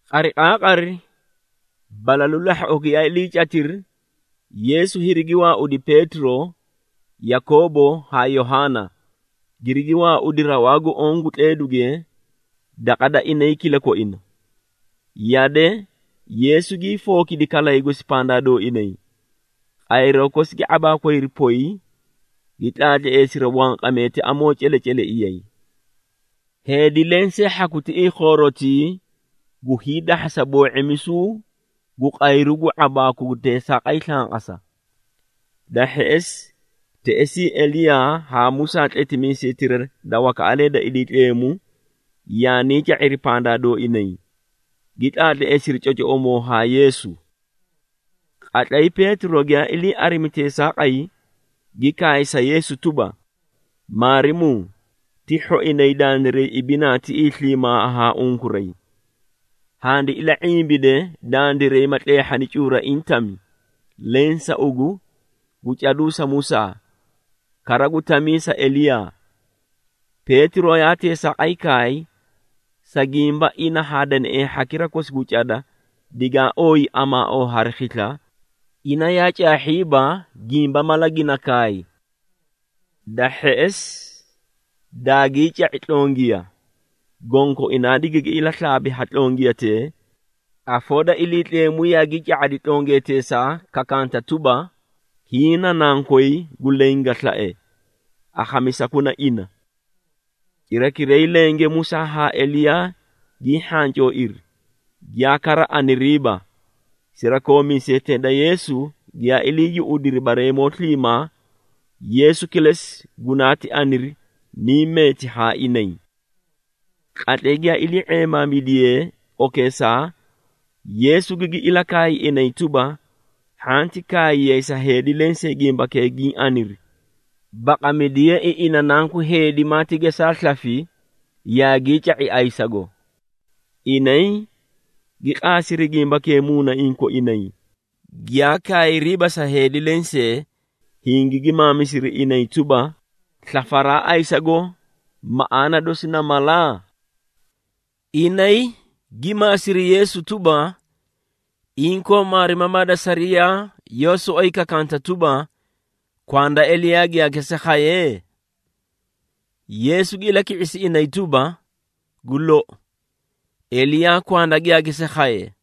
Qariqaaqari, balalu lahhoꞌo giyaa iliicatiri, Yeesu hirigi waaudi Peetiro, Yakoobo haa Yohaana, girigi waaudi rawaa gu oõ gu tleeduge daqa da inay kilakoina. Yade, Yeesu gii fookidi kalay gosi pandaa dooinay. Qayroo kosi gi ⁄abaakwayri poy, gi tlaatleesiri wanqamee ti amoo celeceleiyay. Heedi lensee hhaku tiꞌii khoorotii gu hiidahhasa boo⁄imisuu gu qayru gu ⁄abaaku gu teesaaqay slanqasa. Da hheꞌesi, teꞌesii Eliyaa haa Musaa tletimiisetira da wakaꞌalee da Iliitleemu yaanii ca⁄iri pandaa dooinay, gi tlaatleesiri cocoꞌomoo haa Yeesu. Qatlay Peetiro giyaa ilii arimi teesaaqay, gi kaay sa Yeesu tuba, “Maarimuu, ti hhoinay dandiray ibinaa tiꞌii sliimaa haa unkuray. Handi ila⁄imbide dandiray ma tleehhana cuuraiĩ tami, leẽ sa ugu, gu caduu sa Musaa, kara gu tamii sa Eliyaa.” Peetiro yaa teesaaqay kaay, sa gimba ina haa deneꞌee hhakira kosi gu cada digaa ooyi amaaoo hari khisla, ina yaa caahhiiba gimba mala gina kaay. Da hheꞌesi, daagii ca⁄i tlongiya, gonkoinaa digigi ilaslaabi ha tlongiyatee, afoo da Iliitleemu yaagii ca⁄adi tlongiyateesaa kakanta tuba, “Hiĩ na Nankoy gu leẽ ga slae. Akhamisakuna ina!” Cirakiray lenge Musaa haa Eliyaa gii hhancooiri, giyaa kara aniriiba. Sirakoomiisetee da Yeesu giyaa ilii yuꞌudiri bareemoo sliimaa, Yeesu kilesi gunaati aniri, niĩ meeti haa inay. Qatlay giyaa ilii⁄eemaamidiyee okeesaa, Yeesu gigi ilakaay inay tuba, hhanti kaayiyay sa heedi lensee gimbakee giĩ aniri, baqamidiyeei ina Nanku Heedi maati gesaa slafi yaagii ca⁄i ayisago. Inay gi qaasiri gimbakee muunaiĩ koinay, giyaa kaayriiba sa heedi lensee, hingigi maamisiri inay tuba, “Slafaraa ayisago, maꞌaana dosi na mala?” Inay gi maasiri Yeesu tuba, “Inkoo maarimamaa da sariyaa yoó soꞌoyi kakaanta tuba, kwanda Eliyaa giyaa gesaa khaye?” Yeesu gi ilaki⁄isi inay tuba, “Gu lou, Eliyaa kwanda giyaa gesaa khaye,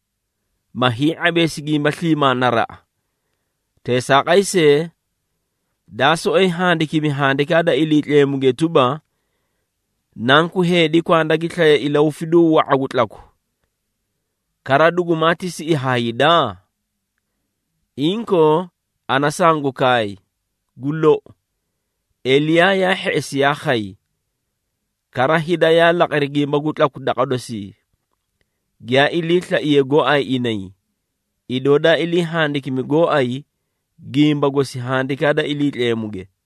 ma hii⁄abeesi gimba sliimaa naraꞌa. Teesaaqay see, daa soꞌoyi handikimi Handikaa da Iliitleemuge tuba, Nanku Heedi kwanda gi slaye ilahufiduu wa⁄a gu tlaku, kara dugumaati siꞌi ha hida? Inkoo ana sangu kaay, gu lou, Eliyaa yaa hheꞌesi yaa khay, kara hida yaa laqiri gimba gu tlaku daqa dosii, giyaa iliislaiyee gooay inay, idoo daa ilii handikimi gooay, gimba gosi Handikaa da Iliitleemuge.”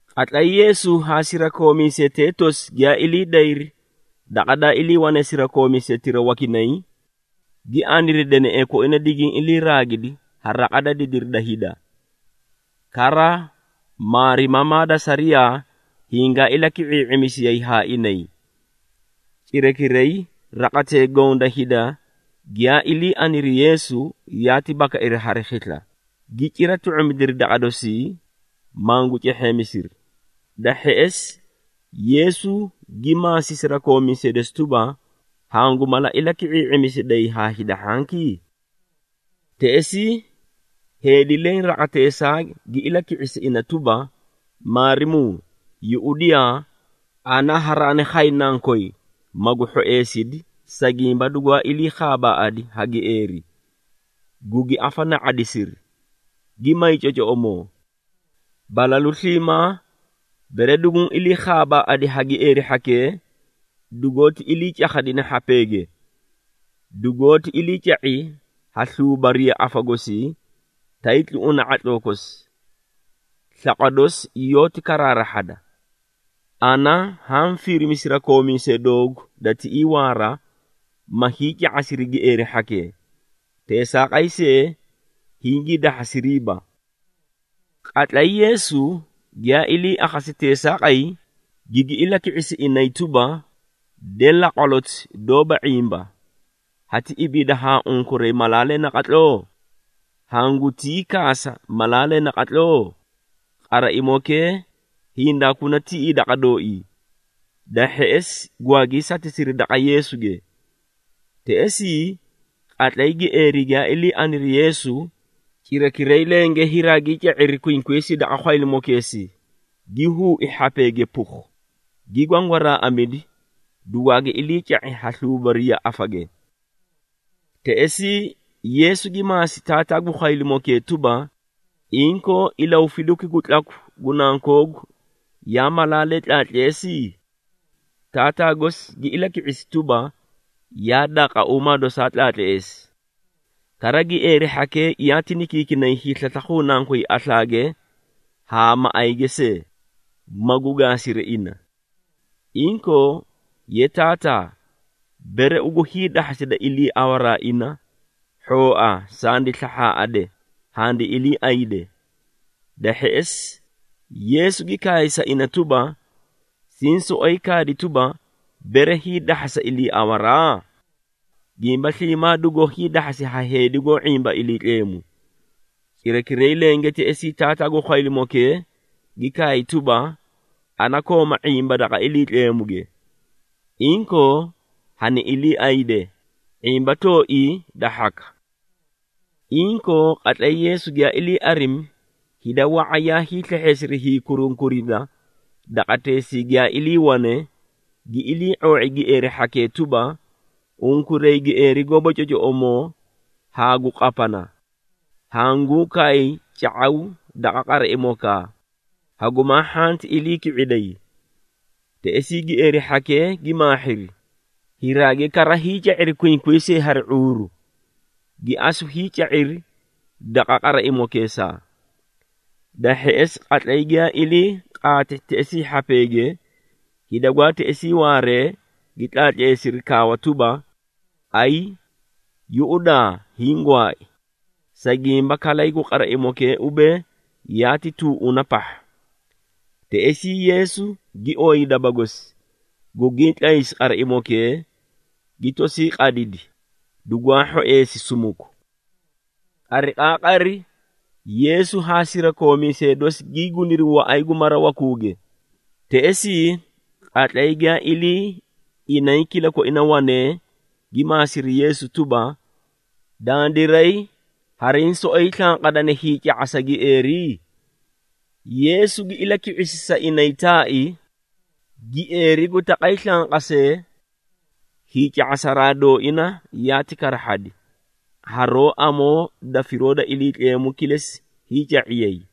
Qatlay Yeesu haa sirakoomiisetee tosi giyaa ilii dayri daqa daa iliiwane sirakoomiisetira wakinay, gi aniri deneꞌee koina digiĩ iliiraagidi ha raqa da didiri da hida. Kara maarimamaa da sariyaa hingaa ilaki⁄ii⁄imisiyay haa inay. Cirakiray raqatee goõ da hida giyaa ilii aniri Yeesu, yaati bakairi hari khisla, gi cira tu⁄umidiri daqa dosii, mangu cehheemisiri. Da hheꞌesi, Yeesu gi maasi sirakoomiisee dosi tuba, “Hangu mala ilaki⁄ii⁄imisiday haa hida hhanki?” Teꞌesii, heedi leẽ raqateesaa gi ilaki⁄isi ina tuba, “Maarimuu, yuꞌudiyaa, ana haraani khay nankoy, magu hhoeesidi, sa gimba dugwaa ilii khaabaaꞌadi ha gieeri, gugi afana⁄adisiri, gi may cocoꞌomoo. Balalu sliimaa bere duguũ ilii khaabaaꞌadi ha gieeri hhakee, dugoóti ilii cakhadi hhapeege, dugoóti iliica⁄i ha sluubariya afa gosii, tay tluꞌuna ⁄atloo kosi, slaqwa dosi yoóti karaarahhada. Ana haã firimi sirakoomiisee doogu da tiꞌii waara, ma hiica⁄asiri gieeri hhakee, teesaaqay see hingii dahhasiriiba.” Qatlay Yeesu giyaa ilii akhasi teesaaqay, gigi ilaki⁄isi inay tuba, “De laqwaloti doóba ⁄imba! Hati ibiida haa unkuray malaalee naqatloo? Hangutii kaasa malaalee naqatloo? Qaraimokee hindaakuna tiꞌii daqa dooii!” Da hheꞌesi gwaagii satisiri daqa Yeesuge. Teꞌesii, qatlay gieeri giyaa ilii aniri Yeesu, cirakiray lenge hiraagii ca⁄iri qwinqwiisii daqa khwaylimokeesii, gi huui hhapeege pukhu, gi gwangwaraaꞌamidi, dugwaagi iliica⁄i ha sluubariya afage. Teꞌesii Yeesu gi maasi taataa gu khwaylimokee tuba, “Inkoo ilahufiduki gu tlaku gu nankoogu yaa malaalee tlaatleesi?” Taataa gosi gi ilaki⁄isi tuba, “Yaa daaqauumaa dosaa tlaatleesi. Kara gieeri hhakee yaati nikiikinay hiislaslakhuu nankoy aslaage haa maꞌayge see, magu gaasiri ina. Inkoo, ye taataa, bere ugu hiidahhasida iliiawaraa ina, hhooa sandi slahhaaꞌade, handi iliiayde.” Da hheꞌesi Yeesu gi kaay sa ina tuba, “Siĩ soꞌoyi kaadi tuba, bere hiidahhasa iliiawaraa? Gimba sliimaa dugoó hiidahhasi ha heedi goó ⁄imba Iliitleemu.” Cirakiray lenge teꞌesii taataa gu khwaylimokee gi kaay tuba, “Ana kooma ⁄imba daqa Iliitleemuge! Inkoo hani iliiayde, ⁄imba tooii da hhaka.” Inkoo, qatlay Yeesu giyaa ilii arimi hida wa⁄a yaa hiislehheesiri hiikurunkurida daqateesii giyaa iliiwane, gi ilii⁄oo⁄i gieeri hhakee tuba, “Unkuray gieeri goóba cocoꞌomoo haa gu qapana, hanguu kaay, ca⁄aw daqa qaraimokaa, hagumaa hhanti ilii ki⁄iday!” Teꞌesii gieeri hhakee gi maahhiri, hiraagi kara hiica⁄iri qwinqwiisii hari ⁄uuru, gi asu hiica⁄iri daqa qaraimokeesaa! Da hheꞌesi qatlay giyaa ilii qaati teꞌesii hhapeege, hida gwaa teꞌesii waaree gi tlaatleesiri kaawa tuba, “Ayii, yuꞌudaa, hiĩ gwaai,” sa gimba kalay gu qaraimokee ubee, yaati tuuꞌuna pahha! Teꞌesii Yeesu gi ooyi daba gosi, gugii tlaysi, qaraimokee gi tosii qadidi, dugwaa hhoeesi sumuku. Qariqaaqari Yeesu haa sirakoomiisee dosi gii guniri waꞌay gu mara wakuuge. Teꞌesii, qatlay giyaa ilii inay kilakoina wanee, gi maasiri Yeesu tuba, “Dandiray hariĩ soꞌoyi slanqadani hiica⁄asa gieeri?” Yeesu gi ilaki⁄isi sa inay taai, “Gieeri gu taqay slanqasee, hiica⁄asaraa dooina yaati karahhadi, haroó amoo da firoo da Iliitleemu kilesi hiica⁄iyay.”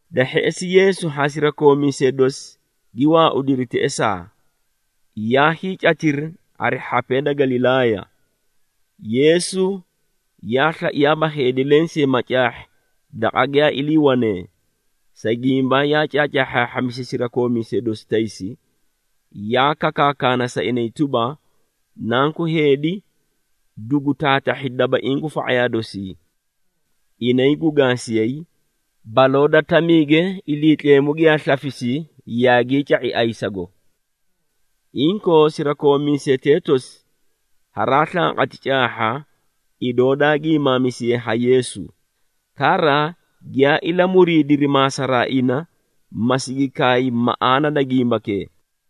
Da hheꞌesi Yeesu haa sirakoomiisee dosi gi waaudiri teꞌesaa, yaa hiicatiri hari hhapee da Galilaaya. Yeesu yaa slaiyaaba heedi lensee ma caahhi daqa giyaa iliiwanee, sa gimba yaa caacaahhaahhamisi sirakoomiisee dosi taysi, yaa kakaakana sa inay tuba, “Nanku Heedi dugu taatahhi dabaiĩ gu fa⁄ayaa dosii. Inay gu gaasiyay, baloo da tamiige Iliitleemu giyaa slafisi yaagii ca⁄i ayisago.” Inkoo sirakoomiisetee tosi haraa slanqati caahha, idoo daa giimaamisiye ha Yeesu, kara giyaa ilamuriidiri maasaraa ina, ma sigi kaay maꞌaana da gimbakee.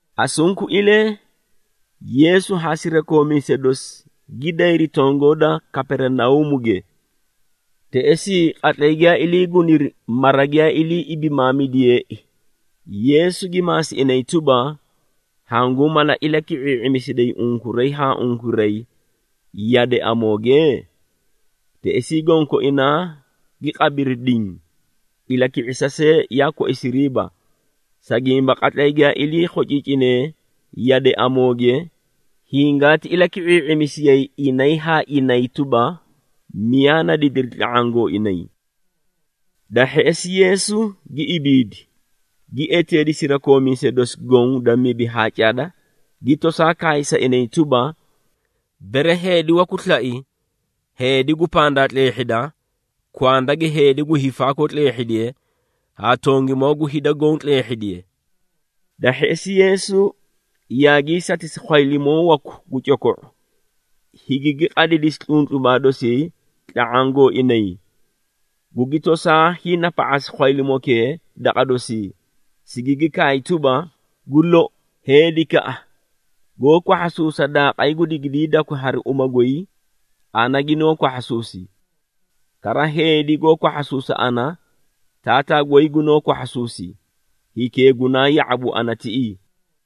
Asunkuilee Yeesu haa sirakoomiisee dosi gi dayri tongoo da Kaperinauumuge. Teꞌesii, qatlay giyaa ilii guniri mara giyaa ilii ibimaamidiyeei, Yeesu gi maasi inay tuba, “Hanguũ mala ilaki⁄ii⁄imisiday unkuray haa unkuray yade amooge?” Teꞌesii gonkoinaa gi qabiri diĩ, ilaki⁄isa see yaa koisiriiba, sa gimba qatlay giyaa ilii khociicinee yade amooge, hingaati ilaki⁄ii⁄imisiyay inay haa inay tuba, miyaa na didiri tla⁄aã gooinay. Da hheꞌesi Yeesu gi ibiidi, gi eteedi sirakoomiisee dosi goõ da mibi haa cada, gi tosaa kaay sa inay tuba, “Bere heedi waku slai heedi gu pandaa tleehhida, kwanda gi heedi gu hiifaakoo tleehhidiye haa tongimoo gu hida goõ tleehhidiye.” Da hheꞌesi Yeesu yaagii satisi khwaylimoo waku gu coko⁄u, higigi qadidisi tluntlubaa dosii tla⁄aã gooinay, gugi tosaa hiinapa⁄asi khwaylimokee daqa dosii, sigigi kaay tuba, “Gu lou, heedikaꞌa goó kwahhasuusa daaqay gu digiidakwi hari uma goy, ana ginoó kwahhasuusi. Kara heedi goó kwahhasuusa ana, Taataa goy gunoó kwahhasuusi, hikee gunaa ya⁄abu ana tiꞌii.”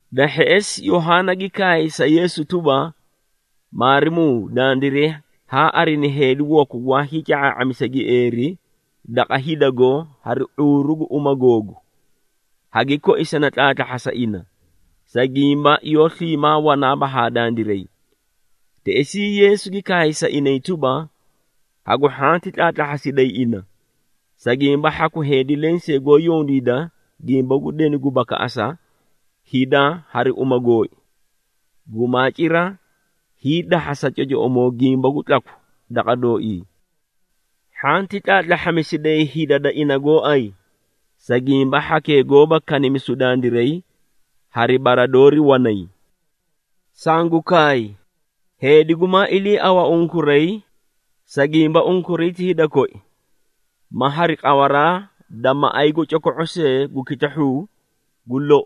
Da hheꞌesi Yohaana gi kaay sa Yeesu tuba, “Maarimuu, dandiray haa arini heedi waku gwaa hiica⁄aa⁄amisi gieeri daqa hidago hari ⁄uuru gu uma googu, hagi koisani tlaatlahhasa ina, sa gimba yoó sliimaa wanaaba haa dandiray.” Teꞌesii Yeesu gi kaay sa inay tuba, “Hagu hhanti tlaatlahhasiday ina, sa gimba hhaku heedi lensee gu yondiida gimba gu denu gu bakaꞌasa hida hari uma gooi, gumaa cira hiidahhasa cocoꞌomoo gimba gu tlaku daqa dooii. Hhanti tlaatlahhamisiday hida da ina gooay, sa gimba hhakee goóba kanimisu dandiray, hari bara doori wanay. Sangu kaay, heedi gumaa iliiawa unkuray, sa gimba unkuray ti hida koi, ma hari qawaraa da maꞌay gu coko⁄o seei gu kitahhuu, gu lou,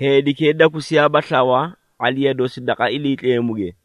heedikee dakusiyaaba slawa ⁄aliya dosi daqa Iliitleemuge.”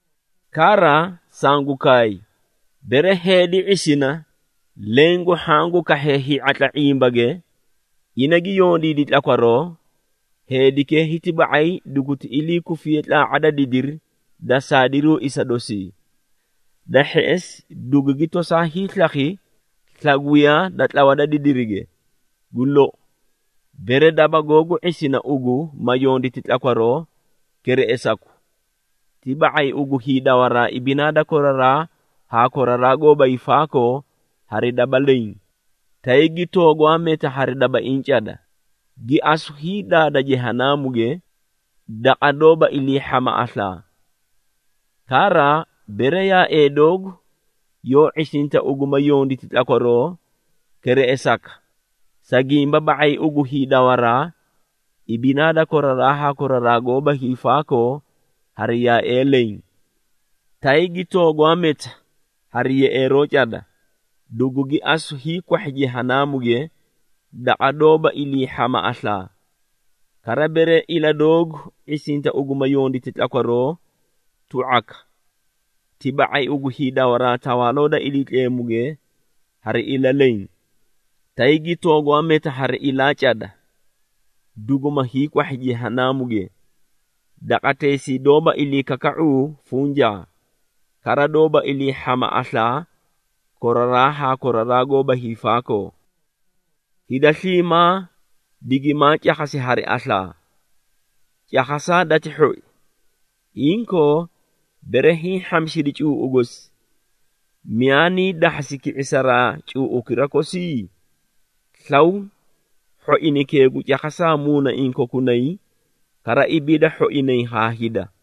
“Kara sangu kaay, bere heedi ⁄isina leẽ gu hhaã gu kahhee hii⁄atla ⁄imbage ina gi yondiidi tlakwaroo, heedikee hiti ba⁄ay duguti ilii kufi tlaa⁄a da didiri da saadiruu isa dosii. Da hheꞌesi, dugugi tosaa hiislakhi slagwiya da tlawa da didirige. Gu lou, bere daba googu ⁄isina ugu ma yonditi tlakwaroo, kereꞌesaku. Ti ba⁄ay ugu hiidawaraa ibinaa da koraraa haa koraraa goóba hiifaakoo hari daba leẽ, tay gi toogwaa meta hari dabaiĩ cada, gi asu hiidaada Jehanaamuge, daqa doóba iliihhama aslaa. Kara bere yaaee doogu yoó ⁄isinta ugu ma yonditi tlakwaroo, kereꞌesaka, sa gimba ba⁄ay ugu hiidawaraa ibinaa da koraraa haa koraraa goóba hiifaakoo hari yaaee leẽ, tay gi toogwaa meta hari yeꞌeeroo cada, dugugi asu hiikwahhi Jehanaamuge, daqa doóba iliihhama aslaa. Kara bere ila doogu ⁄isinta ugu ma yonditi tlakwaroo, tu⁄aka. Ti ba⁄ay ugu hiidawaraa Tawaaloo da Iliitleemuge hari ila leẽ, tay gi toogwaa meta hari ilaa cada, duguma hiikwahhi Jehanaamuge, daqateesii doóba iliikaka⁄uu funjaa, kara doóba iliihhama aslaa koraraa haa koraraa goóba hiifaakoo. Hida sliimaa digimaa cakhasi hari aslaa. Cakhasaa dati hhoi. Inkoo bere hiĩ hhamisidi cuuꞌu gosi, miyaa nii dahhasi ki⁄isaraa cuuꞌukira kosi? Slaw hhoinaykee gu cakhasaa muunaiĩ kokunay, kara ibiida hhoinay haa hida.”